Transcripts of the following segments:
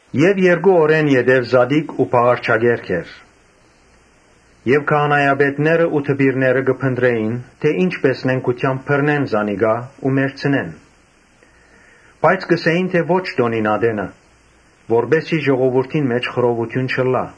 Երկու օր յետոյ զատիկ ու բաղարջակերք էր. եւ քահանայապետներն ու դպիրները կը խորհէին թէ ի՞նչ նենգութեամբ բռնեն զանիկա ու մեռցնեն։ Բայց կ’ըսէին. «Ոչ տօնին ատենը, որպէս զի ժողովուրդին մէջ խռովութիւն չըլլայ»։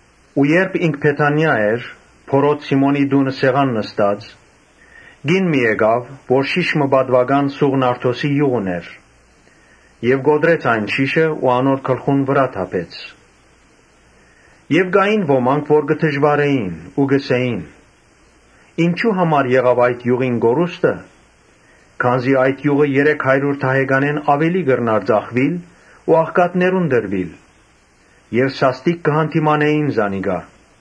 Երբ ինք Բեթանիա էր՝ բորոտ Սիմոնին տունը՝ սեղան նստած, կին մը եկաւ, որ շիշ մը պատուական սուղ նարդոսի իւղ ունէր։ Կոտրեց այն շիշը ու իւղը անոր գլխուն վրայ թափեց։ Կային ոմանք, որ կը նեղուէին ու կ’ըսէին. «Ինչո՞ւ համար եղաւ այդ իւղին կորուստը, Քանզի այդ [իւղը] երեք հարիւր դահեկանէն աւելի կրնար ծախուիլ ու աղքատներուն տրուիլ»։ Եւ սաստիկ կը յանդիմանէին զանիկա։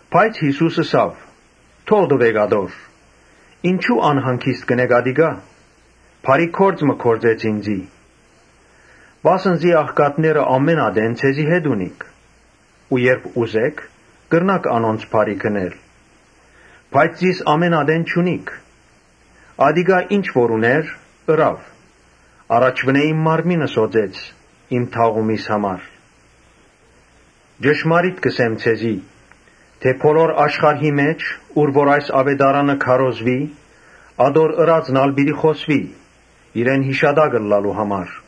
Բայց Յիսուս ըսաւ. «Թող տուէք ատոր, ինչո՞ւ անհանգիստ կ’ընէք, ատիկա բարի գործ մը գործեց ինծի։ Վասն զի աղքատները ամէն ատեն ձեզի հետ ունիք ու երբ ուզէք՝ կրնաք անոնց բարիք ընել, բայց զիս ամէն ատեն չունիք։ Ատիկա ինչ որ ունէր՝ ըրաւ։ Առաջուընէ իմ մարմինս օծեց իմ թաղումիս համար։ Ճշմարիտ կ’ըսեմ ձեզի, թէ բոլոր աշխարհի մէջ, ուր որ այս աւետարանը կը քարոզուի, ատոր ըրածն ալ պիտի յիշուի՝ իրեն յիշատակ ըլլալու համար»։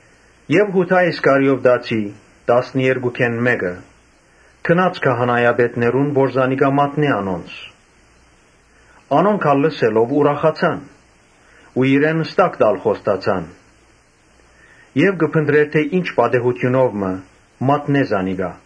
Յուդա Իսկարիովտացի, տասներկուքէն մէկը, գնաց քահանայապետներուն, որ զանիկա մատնէ անոնց։ Անոնք ալ լսելով ուրախացան ու իրեն ստակ ալ խոստացան։ Ան կը փնտռէր յարմար պատեհութիւն մը, որ մատնէ զանիկա։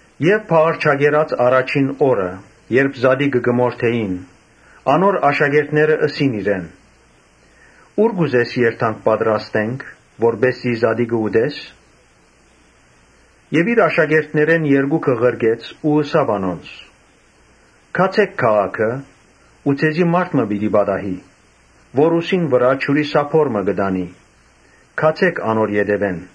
Բաղարջակերաց առաջին օրը, երբ զատիկը կը մորթէին, անոր աշակերտները ըսին իրեն. «Ո՞ւր կ’ուզես որ երթանք պատրաստենք՝ որպէս զի զատիկը ուտես»։ Յիսուս իր աշակերտներէն երկուքը ղրկեց ու ըսաւ անոնց. «Գացէ՛ք քաղաքը ու ձեզի մարդ մը պիտի պատահի՝ որ ուսին վրայ ջուրի սափոր մը կը տանի, գացէ՛ք անոր ետեւէն։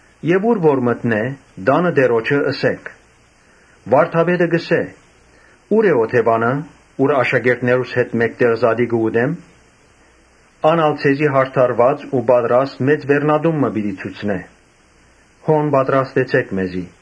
Ուր որ մտնէ, տանը տիրոջը ըսէք. ‘Վարդապետը կ’ըսէ, Ո՞ւր է օթեւանը, ուր աշակերտներուս հետ մէկտեղ կարենամ զատիկը ուտել’։ Ան ալ ձեզի յարդարուած ու պատրաստ մեծ վերնատուն մը պիտի ցուցնէ. հոն պատրաստեցէք մեզի»։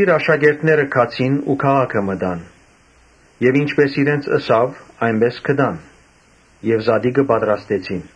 Աշակերտները գացին ու քաղաքը մտան եւ ինչպէս իրենց ըսաւ՝ այնպէս գտան եւ զատիկը պատրաստեցին։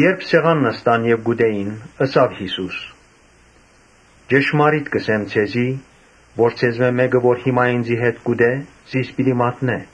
Երբ սեղան նստան եւ կ’ուտէին, ըսաւ Յիսուս. «Ճշմարիտ կ’ըսեմ ձեզի թէ ձեզմէ մէկը որ հիմա ինծի հետ կ’ուտէ, զիս պիտի մատնէ»։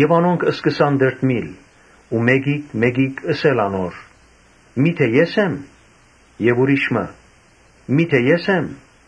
Անոնք սկսան տրտմիլ ու մէկիկ մէկիկ ըսել անոր. «Միթէ ե՞ս եմ». եւ ուրիշ մը՝ «Միթէ ե՞ս եմ»։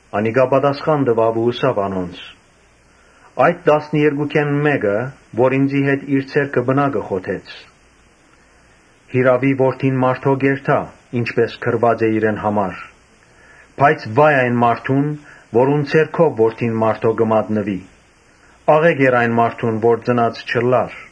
Անիկա պատասխան տուաւ ու ըսաւ անոնց. «Տասներկուքէն ան, որ ինծի հետ իր ձեռքը պնակը խոթեց։ Յիրաւի Որդին մարդոյ կ’երթայ, ինչպէս գրուած է իրեն համար. բայց վա՜յ այն մարդուն, որուն ձեռքով Որդին մարդոյ կը մատնուի։ Աղէկ էր այն մարդուն որ ծնած չըլլար»։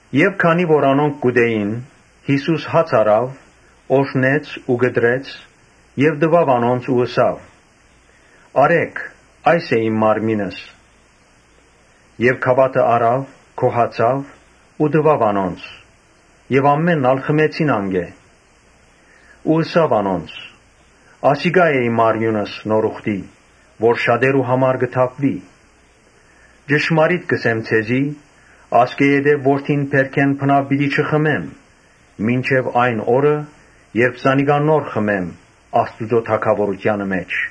Երբ անոնք կ’ուտէին, Յիսուս հաց առաւ, օրհնեց ու կտրեց եւ տուաւ անոնց ու ըսաւ. « Ոմանք, Առէք, կերէքԱռէ՛ք, ա՛յս է իմ մարմինս»։ Եւ գաւաթը առաւ, գոհացաւ ու տուաւ անոնց։ Ամէնքն ալ խմեցին անկէ։ Ըսաւ անոնց. «Ասիկա է իմ արիւնս նոր ուխտի, որ շատերու համար պիտի թափուի։ Ճշմարիտ կ’ըսեմ ձեզի, Ասկէ յետոյ որթին բերքէն բնաւ պիտի չխմեմ մինչեւ այն օրը, երբ նոր գինին խմեմ Աստուծոյ թագաւորութեանը մէջ»։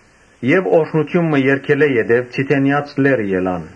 Օրհնութիւն մը երգելէ յետոյ Ձիթենեաց լեռը ելան։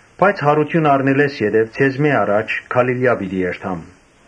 Բայց յարութիւն առնելէս ետքը ձեզմէ առաջ Գալիլիա պիտի երթամ»։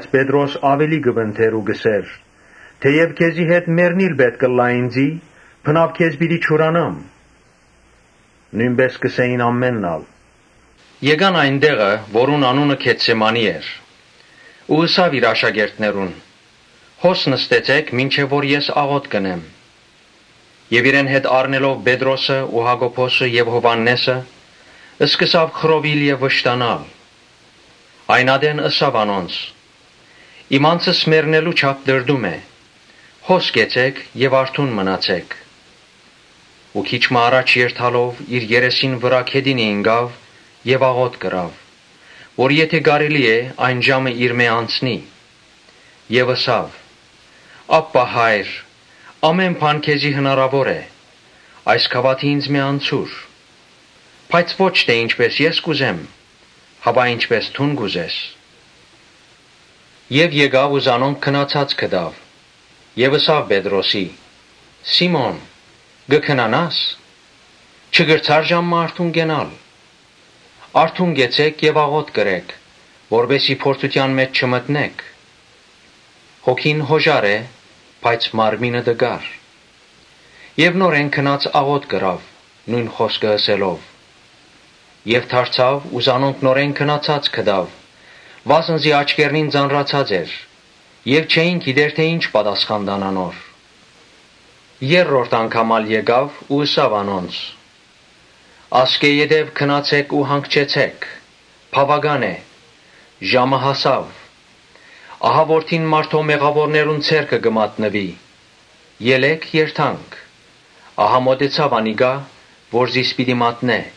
Պետրոս աւելի կը պնդէր ու կ’ըսէր. «Թէեւ քեզի հետ մեռնիլ ալ պէտք ըլլայ ինծի, բնաւ քեզ պիտի չուրանամ». նոյնպէս կ’ըսէին բոլորն ալ։ Եկան այն տեղը որուն անունը Գեթսեմանի էր ու ըսաւ իր աշակերտներուն. «Հո՛ս նստեցէք, մինչեւ որ ես աղօթք ընեմ»։ Իրեն հետ առնելով Պետրոսը ու Յակոբոսը եւ Յովհաննէսը, սկսաւ խռովիլ եւ վշտանալ։ Այն ատեն ըսաւ անոնց. «Իմ անձս մեռնելու չափ տրտում է. հո՛ս կեցէք եւ արթուն մնացէք»։ Քիչ մը առջեւ երթալով՝ իր երեսին վրայ գետինը ինկաւ եւ աղօթք ըրաւ, որ եթէ կարելի է, այն ժամը իրմէ անցնի։ Եւ ըսաւ. «Աբբա՛ Հայր՝ ամէն բան քեզի հնարաւոր է, այս գաւաթը ինծմէ անցուր. բայց ո՛չ թէ ինչպէս ես կ’ուզեմ, հապա ինչպէս դուն կ’ուզես»։ Երբ եկաւ ու զանոնք քնացած գտաւ՝ ըսաւ Պետրոսին. «Սի՛մոն, կը քնանա՞ս, չկրցա՞ր ժամ մը արթուն կենալ։ Արթո՛ւն կեցէք եւ աղօթք ըրէք, որպէս զի փորձութեան մէջ չմտնէք. հոգին յօժար է, բայց մարմինը տկար»։ Նորէն գնաց աղօթք ըրաւ՝ նոյն խօսքը ըսելով։ Եւ դարձաւ ու զանոնք նորէն քնացած գտաւ, վասն զի աչքերնին ծանրացած էր եւ չէին գիտեր թէ ի՞նչ պատասխան տան անոր։ Երրորդ անգամ ալ եկաւ ու ըսաւ անոնց. «Ասկէ յետոյ քնացէ՛ք ու հանգչեցէ՛ք. բաւական է, ժամը հասաւ, ահա Որդին մարդոյ մեղաւորներուն ձեռքը պիտի մատնուի։ Ելէ՛ք երթանք։ Ահա մօտեցաւ անիկա որ զիս պիտի մատնէ»։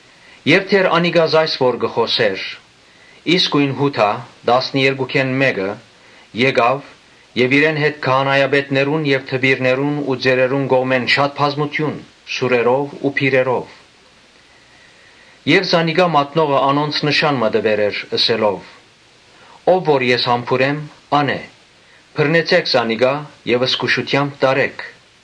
Դեռ անիկա կը խօսէր, երբ Յուդան, տասներկուքէն մէկը, եկաւ եւ իրեն հետ քահանայապետներուն եւ դպիրներուն ու ծերերուն կողմէն շատ բազմութիւն՝ սուրերով ու բիրերով։ Զանիկա մատնողը անոնց նշան մը տուեր էր՝ ըսելով. «Ո՛վ որ ես համբուրեմ՝ ա՛ն է, բռնեցէ՛ք զանիկա եւ զգուշութեամբ տարէք»։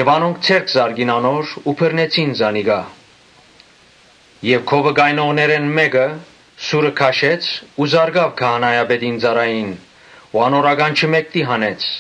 Անոնք ձեռք զարկին անոր ու բռնեցին զանիկա։ Եւ քովը կայնողներէն մէկը սուրը քաշեց ու զարկաւ քահանայապետին ծառային ու անոր ականջը մէկդի հանեց։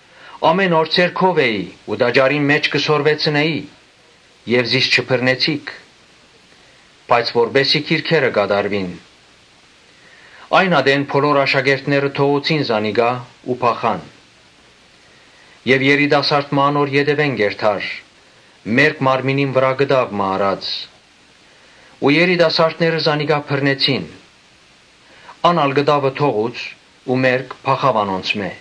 Ամէն օր ձեր քով էի ու տաճարին մէջ կը սորվեցնէի եւ զիս չբռնեցիք, բայց որպէս զի գրքերը կատարուին»։ Այն ատեն բոլոր աշակերտները թողուցին զանիկա ու փախան։ Երիտասարդ մը անոր ետեւէն կ’երթար՝ մերկ մարմինին վրայ կտաւ մը առած ու երիտասարդները զանիկա բռնեցին. Ան ալ կտաւը թողուց ու մերկ փախաւ անոնցմէ։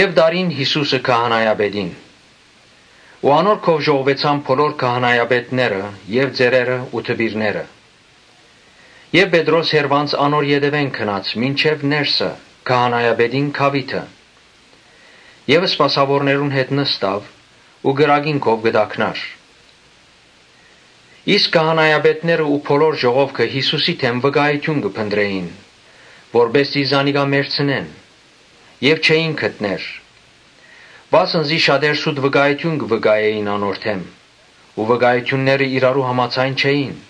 Տարին Յիսուսը քահանայապետին, անոր քով ժողվուեցան բոլոր քահանայապետները եւ ծերերը ու դպիրները։ Պետրոս հեռուէն անոր ետեւէն գնաց մինչեւ ներսը, քահանայապետին գաւիթը սպասաւորներուն հետ նստաւ ու կրակին քով կը տաքնար։ Քահանայապետներն ու բոլոր ժողովը Յիսուսին դէմ վկայութիւն կը փնտռէին, որպէս զի զանիկա մեռցնեն եւ չէին գտներ. Վասն զի շատեր սուտ վկայութիւն կ’ընէին անոր դէմ, բայց վկայութիւնները իրարու համաձայն չէին։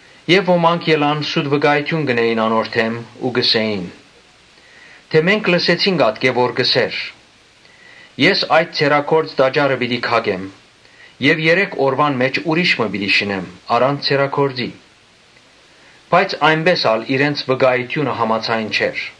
Ոմանք ելան սուտ վկայութիւն կ’ընէին անոր դէմ ու կ’ըսէին. «Մենք լսեցինք ատկէ, որ կ’ըսէր, ‘Ես այդ ձեռագործ տաճարը պիտի քակեմ եւ երեք օրուան մէջ ուրիշ մը պիտի շինեմ առանց ձեռագործի’»։ Բայց այնպէս ալ իրենց վկայութիւնը համաձայն չէր։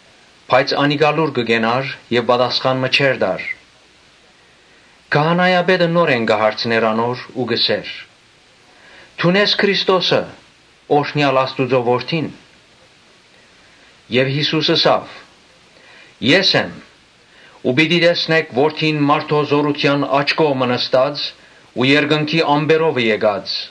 Բայց ան լուռ կը կենար եւ պատասխան մը չէր տար։ Քահանայապետը նորէն կը հարցնէր անոր ու կ’ըսէր. «Դո՞ւն ես Քրիստոսը, օրհնեալ Աստուծոյ Որդին»։ Յիսուս ըսաւ. «Ես եմ. ու պիտի տեսնէք Որդին մարդոյ Զօրութեան աջ կողմը նստած ու երկնքի ամպերովը եկած»։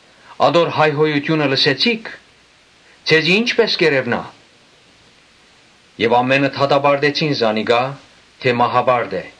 Ատոր հայհոյութիւնը լսեցիք. ձեզի ի՞նչպէս կ’երեւնայ»։ Ամէնքը դատապարտեցին զանիկա՝ թէ մահապարտ է։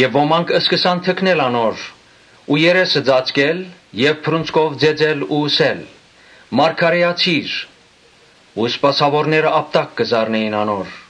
Ոմանք սկսան թքնել ու անոր երեսը ծածկել եւ բռունցքով ծեծել ու ըսել. «Մարգարէացի՛ր»։ Սպասաւորները ապտակ կը զարնէին անոր։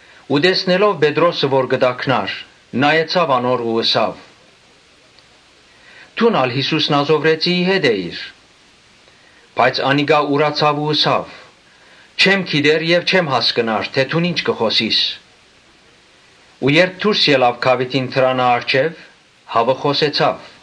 Ու տեսնելով Պետրոսը որ կը տաքնար՝ նայեցաւ անոր ու ըսաւ. «Դո՛ւն ալ Յիսուս Նազովրեցիին հետ էիր»։ Բայց անիկա ուրացաւ ու ըսաւ. «Չեմ գիտեր եւ չեմ հասկնար թէ դուն ի՞նչ կը խօսիս»։ Երբ դուրս ելաւ գաւիթին դրանը առջեւ, հաւը խօսեցաւ։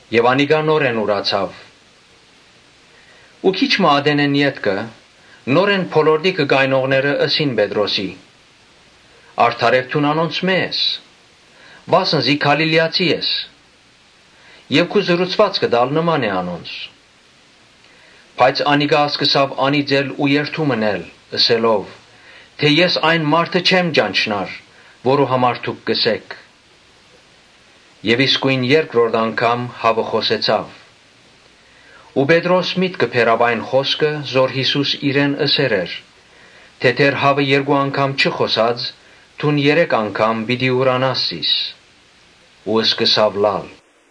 Եւ անիկա նորէն ուրացաւ։ Ու քիչ մը ետքը՝ նորէն հոն կայնողները ըսին Պետրոսին. «Արդարեւ դուն անոնցմէ ես, վասն զի Գալիլիացի ես եւ քու խօսուածքդ ալ նման է անոնց»։ Բայց անիկա սկսաւ անիծել ու երդում ընել՝ ըսելով. «Ես այն մարդը չեմ ճանչնար, որուն համար դուք կ’ըսէք»։ Իսկոյն երկրորդ անգամ հաւը խօսեցաւ։ Պետրոս միտքը բերաւ այն խօսքը, որ Յիսուս իրեն ըսեր էր. «Դեռ հաւը երկու անգամ չխօսած՝ դուն երեք անգամ պիտի ուրանաս զիս»։ Ու սկսաւ լալ։